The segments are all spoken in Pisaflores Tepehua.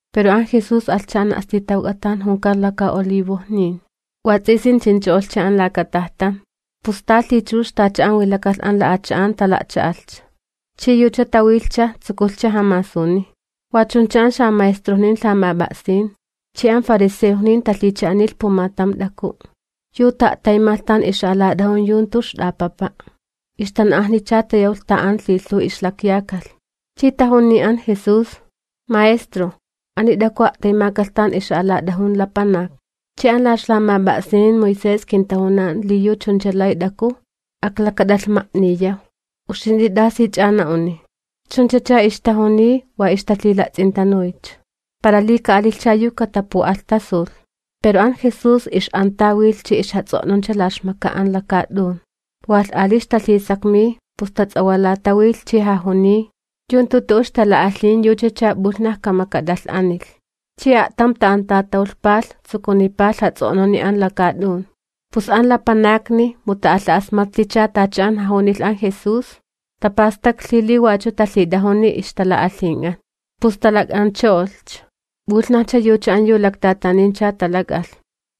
Pero an Jesús alhcha an a'stitawk'a tan junkan Laka Olivojnin. Wats'isin chincho'olhcha an laka tajtan, pus ta lhichux tacha an wilakalh an la'achan tala'cha'alhcha, chi yucha tawilhcha, tsukulhcha jamasuniy. Wa chuncha an xamaestrojnin lhamap'a'sin chi an fariseojnin talhicha'anilh pumatam t'aku', yu ta'a'taymalh tan ixa'alat'ajun yu jantu yu ixt'apapa', ixtan'ajnicha tayawlh an tan lhilhuw ixlakyakalh, chi tajuniy an Jesús: ―Maestro, ani t'aku a'taymakalh tan ixa'alat'ajun lapanak, chi an la ixlamap'a'sin Moisés kintajunan li yu chuncha lay t'aku aklakat'alhmayaw sta kaniya'. ¿Uxint'i t'asich'a na'uni? Chunchacha ixtajuniy wa ixtalhila'ts'intanuycha, para li ka'alilhcha yu katapu'alhtasulh. Pero an Jesús ix'antawilh chi ixjats'o'nuncha la ixmaka an lakaat'un. Walh ali ixtalhisakmiy, pus tats'awalatawilh chi jajuniy: ―Yu jantu tu'u ixtala'alhin yuchacha p'ulhnaj kamakat'alh'anilh. Chi a'tam ta'antatawlhpalh, tsukunipalh jats'o'nuni an lakaat'un. Pus an lapanakni mu ta'alha'asmatlhicha tacha an jajunilh an Jesús, tapastaklhi li wachu talhit'ajuni ixtala'alhink'an, pus talak'ancho'olhcha. P'ulhnajcha yucha an yu laktatanincha talak'alh,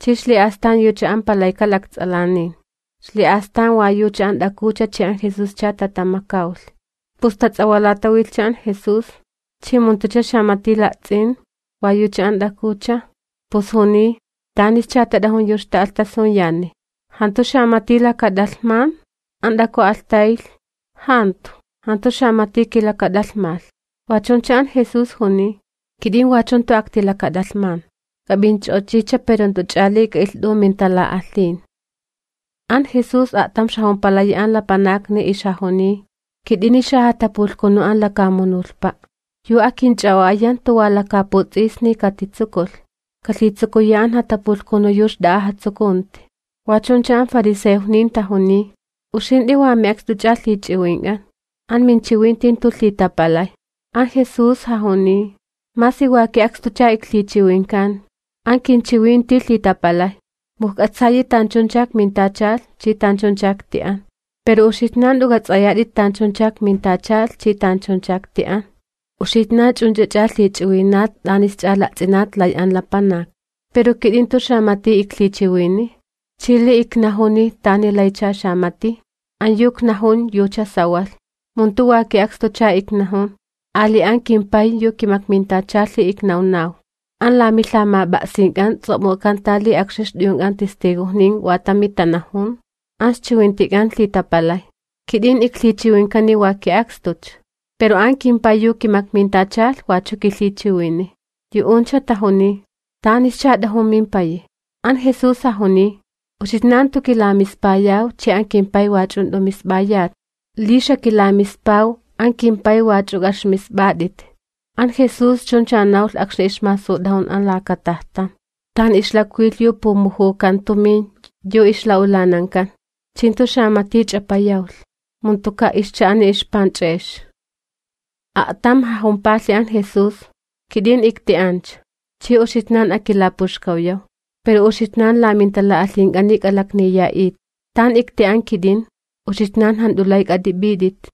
chi ixli'astan yucha an yu palayka lakts'alanin. Xli'astan wa yucha an t'akucha chi an Jesuscha tatamakawlh. Pus tats'awalatawilhcha an Jesús chi mu jantucha xamati la'ts'in wa yucha an t'akucha, pus juniy: ―¿Tanischa tat'ajun yu ixta'alhtasuyani? ¿Jantu xamati lakat'alhman? An t'aku alhtaylh: ―Jantu, jantu xamati kilakat'alhmalh. Wa chuncha an Jesús juniy: ―Kit'in wachu jantu aktilakat'alhman, k'ap'inch'o'ochicha pero jant'uch'a ali k'a'ilht'u mintala'alhin.] An Jesús a'tam jaxa'alapalhi an lapanakni, jajuniy: ―Kit'ini xajatapulhkunu an lakamunulhpa', yu akinch'a'o'aya jantu wa lakaputs'isni katitsukulh, kalhitsukuya an jatapulhkunu yu xt'a'a jatsukunti. Wa chuncha an fariseojnin tajuniy: ―Uxint'i wa mi'akst'uch'a lhich'iwink'an, aminchiwinti jantu lhitapalay. An Jesús jajuniy: ―Masi wa ki'akstucha iklhichiwinkan, an kinchiwinti lhitapalay, mu ijk'atsayi tanchuncha ikmintachalh chi tanchuncha ikti'an. Pero uxitnan jant'u k'ats'ayat tanchuncha ikmintachalh chi tanchuncha ikti'an. Uxitnan ch'unch'ach'a lhich'iwinat t'anisch'a la'ts'inat lay an lapanak, pero kit'in jantu xamati iklhichiwiniy. Chi li iknajuni tani laycha xamati, an yu iknajun yucha sawalh, mu jantu wa ki'akstucha iknajun, ali an kimPay yu kimakmintachalhi iknawnaw. An la milhamap'a'sink'an ts'o'muk'akanta li akxni ixt'uyunk'an yu tala'ts'ilh tu'u wa tami tanajun, an ixchiwintik'an lhitapalay. Kit'in iklhichiwinkani wa ki'akstucha, pero an kimPay yu kimakmintachalh wachu kilhichiwiniy. Yu'uncha tajuniy: ―¿Tanischa t'ajun mimpayi? An Jesús jajuniy: ―Uxitnan jantu kilamispayaw chi an kimPay wach'u jant'u misp'ayat. Li xakilamispaw, an kimPay wach'u k'a'ixmisp'at'it. An Jesús chuncha nawlh akxni ixmasut'ajun an laka tajtan, tan ixlakwilh yu pumujukan tumin yu ixla'ulanankan, chi jantu xamati ch'apayawlh mu jantuka' ixcha'ani ixpanch'e'ex. A'tam jajumpalhi an Jesús: ―Kit'in ikti'ancha, chi uxitnan akilapuxkawyaw, pero uxitnan la mintala'alhink'ani k'alakniya'it. Tan ikti'an kit'in, uxitnan jant'u lay k'at'ip'it'it.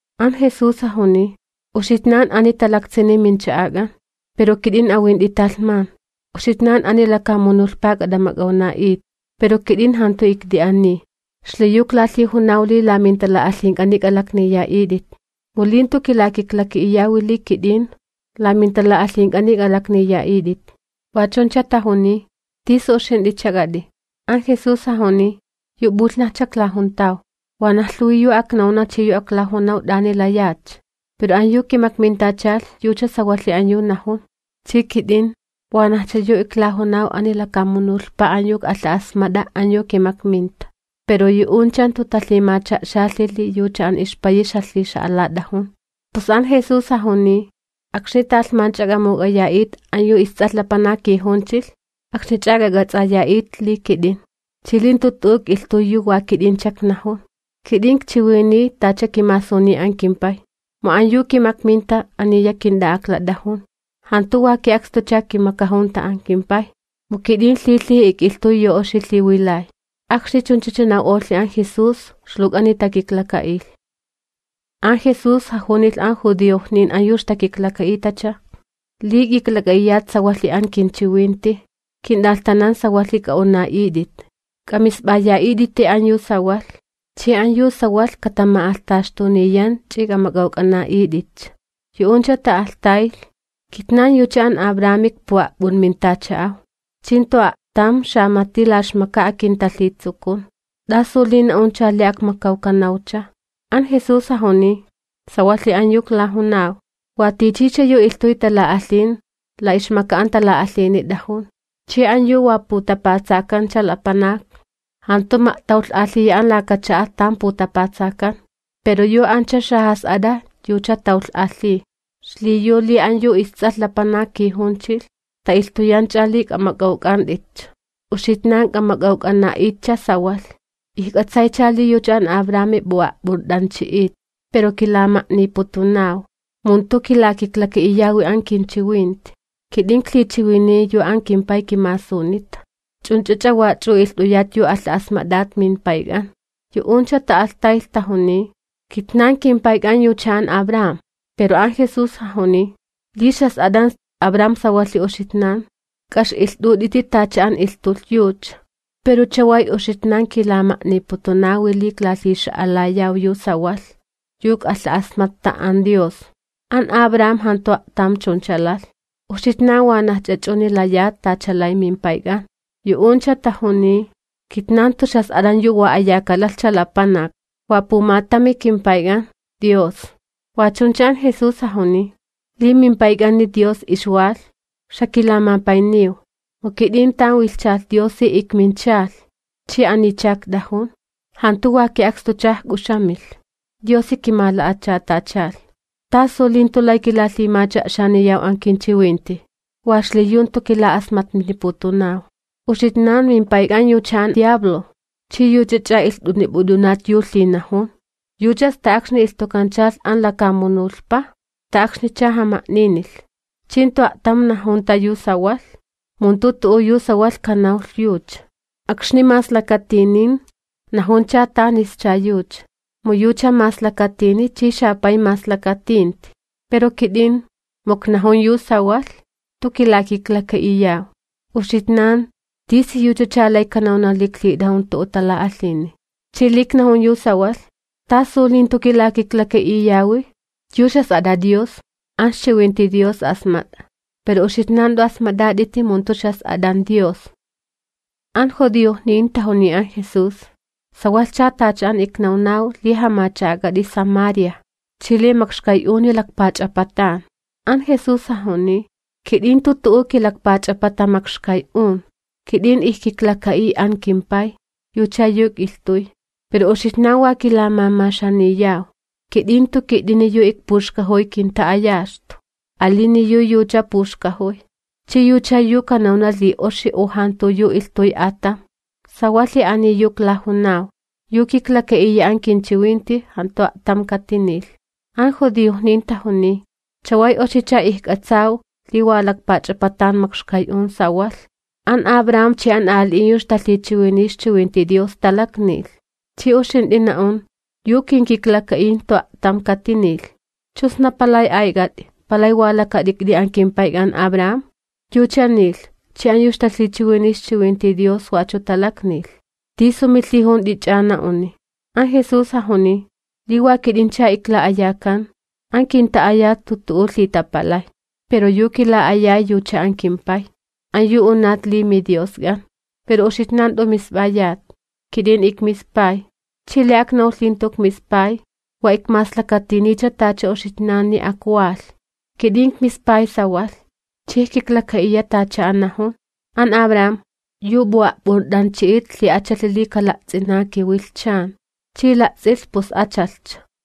An Jesús jajuniy: ―Uxitnan ani talaktsini mincha'ak'an, pero kit'in awint'i talhman. Uxitnan ani lakamunulhpa k'at'amak'awna'it, pero kit'in jantu ikde ani. Xliyu iklalhijunaw li la mintala'alhink'ani k'alakniya'it'it, mu li jantu kilakiklaka'iyawi li kit'in, la mintala'alhink'ani k'alakniya'it'it. Wa chuncha tajuniy: ―¿Tisu uxint'ichak'at'i? An Jesús jajuniy: ―Yu p'ulhnajcha iklajuntaw. Wanaj lhuwi yu aknawna chi yu aklajunaw t'ani layatcha, pero an yu kimakmintachalh yucha sawalhi an yu najun, chi kit'in, wanajcha yu iklajunaw ani lakamunulhpa an yu ik'alha'asmat'a an yu kimakminta. Pero yu'uncha jantu talhimacha'xalhi li yucha an ixPayi ixjalhixa'alat'ajun. Pus an Jesús jajuniy: ―Akxni talhmancha k'amuk'aya'it an yu isTs'alh Lapanak kijunchilh, akxnich'a k'ak'ats'aya'it li kit'in, chi li jantu tu'u ik'ilhtuy yu wa kit'incha iknajun, kit'in ikchiwiniy tacha kimasuniy an kimPay. Mu an yu kimakminta aniya kint'a'aklat'ajun, jantu wa ki'akstucha kimakajunta an kimPay, mu kit'in lhilhiji ik'ilhtuy yu oxi lhiwilay. Akxni chunchacha naw'olh an Jesús, ixluwk'ani takiklaka'ilh. An Jesús jajunilh an judiojnin an yu ixtakiklaka'itacha: ―Li k'iklak'a'iyat sawalhi an kinchiwinti, kint'alhtanan sawalhi k'a'una'it'it. K'amisp'aya'it'iti an yu sawalh, chi an yu sawalh katama'alhtaxtuniyan chi k'amak'awk'ana'it'itcha. Yu'uncha ta'alhtaylh: ―Kitnan yucha an Abrami ikpu'a'p'unmintacha'aw, chi jantu a'tam xamati la ixmaka akintalhitsukun, ¿t'asu li na'uncha li akmakawkanawcha? An Jesús jajuniy: ―Sawalhi an yu iklajunaw, wa tichicha yu ilhtuy tala'alhin, la ixmaka an tala'alhini t'ajun. Chi an yu wa putapatsakancha lapanak, jantu ma'tawlh'alhiya an laka cha'a tan putapatsakan, pero yu ancha xajas'at'a yucha tawlh'alhiy. Xliyu li an yu isTs'alh Lapanak kijunchilh ta'ilhtuyancha li k'amak'awk'ant'itcha, uxitnan k'amak'awk'ana'itcha sawalh. Ijk'atsaycha li yucha an Abrami p'u'a'p'unt'anchi'it pero kilama'niputunaw, mu jantu kilakiklaka'iyawi an kinchiwinti. Kit'in iklhichiwiniy yu an kimPay kimasunita, ch'unch'ach'a wach'u ilht'uyat yu alha'asmat'at mimpayk'an. Yu'uncha ta'alhtaylh tajuniy: ―¡Kitnan kimpayk'an yucha an Abram! Pero an Jesús jajuniy: ―Li ixjas'at'an Abram sawalhi uxitnan, k'a'ix'ilht'ut'iti tacha an ilhtulh yucha. Pero chaway uxitnan kilama'niputunawi li iklalhixa'alayaw yu sawalh, yu ik'alha'asmatta an Dios. An Abram jantu a'tam chuncha lalh. Uxitnan wanajch'a ch'uni layat tacha lay mimpayk'an. Yu'uncha tajuniy: ―¡Kitnan jantu wa a'chunancha! ¡Wa pumatami kimPayk'an, Dios! Wa chuncha an Jesús jajuniy: ―Li mimPayk'ani Dios ixwalh, xakilamapayniw, mu kit'in tan wilhchalh Diosi ikminchalh chi anicha ikt'ajun, jantu wa ki'akstucha ijk'uxamilh, Diosi kimala'achatachalh. ¿Tasucha li jantu lay kilalhimacha'xaniyaw an kinchiwinti? Wa xliyu jantu kila'asmatniputunaw. Uxitnan mimpayk'an yucha an xapay makxkay'un, ch'i yuch'ach'a ach'aniyat ilht'unip'ut'unat yu lhinajun. Yucha sta akxni ilhtukanchalh an lakamunulhpa, sta akxnicha jama'ninilh, chi jantu a'tam najunta yu sawalh, mu jantu tu'u yu sawalh kanawlh yucha. Akxni maslakatinin, najuncha tanischa yucha, mu yucha maslakatini', chi xapay maslakatinti. Pero kit'in, mu iknajun yu sawalh, jantu kilakiklaka'iyaw. Uxitnan, ¿tisiyuchacha lay kanawna li iklhit'ajun tu'u tala'alhini? Chi li iknajun yu sawalh, ¿tasu li jantu kilakiklaka'iyawi? Yu ixjas'at'a Dios, an ixchiwinti Dios asmat'a pero uxitnan jant'u asmat'at'iti mu jantu ixjas'at'an Dios. An judiojnin tajuniy an Jesús: ―Sawalhcha tacha an iknawnaw li jamacha'ak'at'i Samaria chi li makxkay'uni lakpach'apatan. An Jesús jajuniy: ―Kit'in jantu tu'u kilakpach'apata makxkay'un. Kit'in ijkiklaka'iy an kimPay, yucha yu ik'ilhtuy, pero uxitnan wa kilamamaxaniyaw. Kit'in jantu kit'ini yu ikpuxkajuy kinta'ayaxtu, alini yu yucha puxkajuy, chi yucha yu kanawna li oxi u jantu yu ilhtuy atam. Sawalhi ani yu iklajunaw, yu kiklaka'iya an kinchiwinti, jantu a'tam katinilh. An judiojnin tajuniy: ―Chaway oxicha ijk'atsaw li wa lakpach'apatan makxkay'un sawalh. An Abraham chi an ali'in yu ixtalhichiwiniy ixchiwinti Dios talaknilh, chi uxint'i na'un: “Yu kinkiklaka'iy jantu a'tam katinilh.” ¿Chu sna palay ayk'at'i, palay wa lakat'ikt'i an kimpayk'an Abraham? Yucha nilh, chi an yu ixtalhichiwiniy ixchiwinti Dios wachu talaknilh. ¿Tisu milhijunt'ich'a na'uni? An Jesús jajuniy: ―Li wa kit'incha ikla'ayakan, an kinta'ayat jantu tu'u lhitapalay. Pero yu kila'ayay yucha an kimPay, an yu unat li miDiosk'an. Pero uxitnan jant'u misp'ayat. Kit'in ikmispay, chi li aknawlh li jantu ikmispay, wa ikmaslakatinincha tacha uxitnan. Kit'in ikmispay sawalh, chi ijkiklaka'iya tacha an najun. An Abraham, yu p'u'a'p'unt'anchi'it lhi'achalhi li kala'ts'ina kiwilhchan, chi la'ts'ilh, pus achalhcha.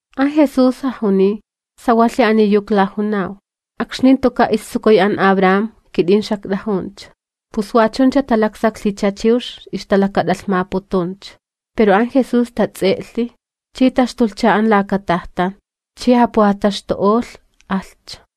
An Jesús jajuniy: ―Sawalhi ani yu iklajunaw, akxni jantuka' istsukuy an Abraham, kit'in xakt'ajuncha. Pus wa chuncha talaksaklhicha chiwx ixtalakat'alhmaputuncha. Pero an Jesús tats'e'lhi chi taxtulhcha an laka tajtan chi japujataxtu'olh, alhcha.